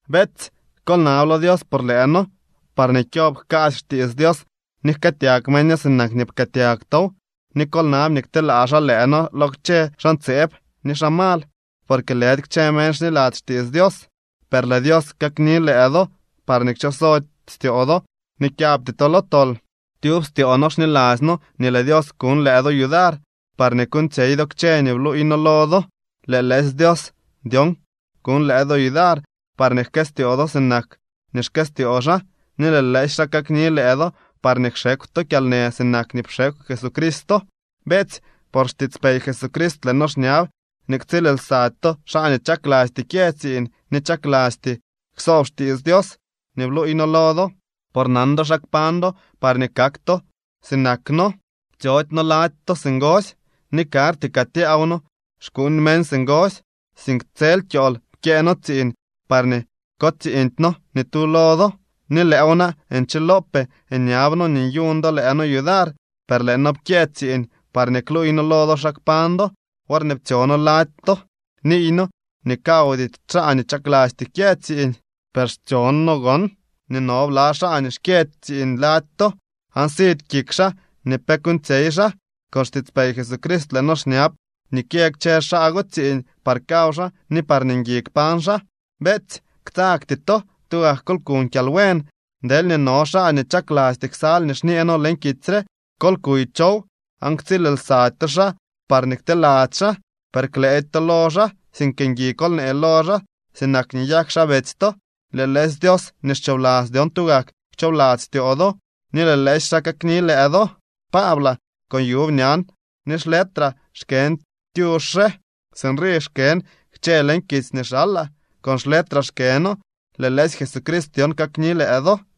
Beetsy, kol nab lo Dios por lëë noo parñee kyob jkaasy xtiits Dios ni jkëëtyag meño sinak nii pkëëtyag tow. Ni kol nab nii kteelaa xaa lëë noo lo kchë xaa ntseeb ni xaa mal, porque lëdy kchë meñ xniladzy xtiits Dios. Per lëë Dios kakni lëë do parñee kchoxsody styoo do ni kyabty to lo tol. Tyub styoo noo xniladzy noo nii lëë Dios kuñ lëë do yudar parñee kuuñtsyey do kchë nii bluuy noo lo do. Lëë lëësy Dios dyon kuñ lëë do yudar parñee jkëstyoo do sinak nii xkëstyoo xaa, ni lëë lëësy xaa kakni lëë do parñee kxekw to kyalnë sinak nii pxekw Jesucristo. Beetsy, por xtiitspey Jesucrist lëë noo xñab nii ktsiil lsady to xaa nii chaklasty kyë tsiiñ ni chaklasty ksoob xtiits Dios nii bluuy noo lo do. Por nan do xa kpañ do parñee kak to sinak noo. Ptsyody noo lady to singosy, ni karty kaa tyaaw noo xkuuñ meñ singosy, sink tsel kyool pkyëë noo tsiiñ parñee kotsiiñdy noo ni tu lo do. Ni lëëw na nchilopee nyab noo nii nyuñ do lëë noo yudar, per lëë noo pkyëë tsiiñ parñee kluuy noo lo do xa kpañ do. Worñee ptsyo noo lady to niiy noo nii kawdy xaa nii chaklasty kyë tsiiñ. Per xtsyon noo gon nii no bla xaa nii xkyëdy tsiiñ lady to, aan sidy kik xaa nii pe kuuñtsyey xaa. Con xtiitspey Jesucrist lëë noo xñab nii kyë kchë xaa go tsiiñ par kaw xaa ni parñee ngui kpañ xaa. Beetsy, ktsagty to, tugak kol kuñ kyalbuen. Deelñee no xaa nii chaklasty ksal nii xñee noo leñ kitsy re, kol kuy chow aan ktsiil lsady to xaa parñee kteladzy xaa. Per klëëdy to lo xaa, sink ngui kol nee lo xaa sinak nii nyak xaa betsy to. Lëë lëësy Dios nii xchoobladzy dyon tugak kchoobladzy styoo do ni lëë lëësy xaa kakni lëë do. Paablaa, con yuub ñan ni xletraa xkën tyux re. Sinrii xkën kchë leñ kitsy nii xalaa, con xletraa xkëno. Lëë lëësy Jesucrist dyon kakni lëë do.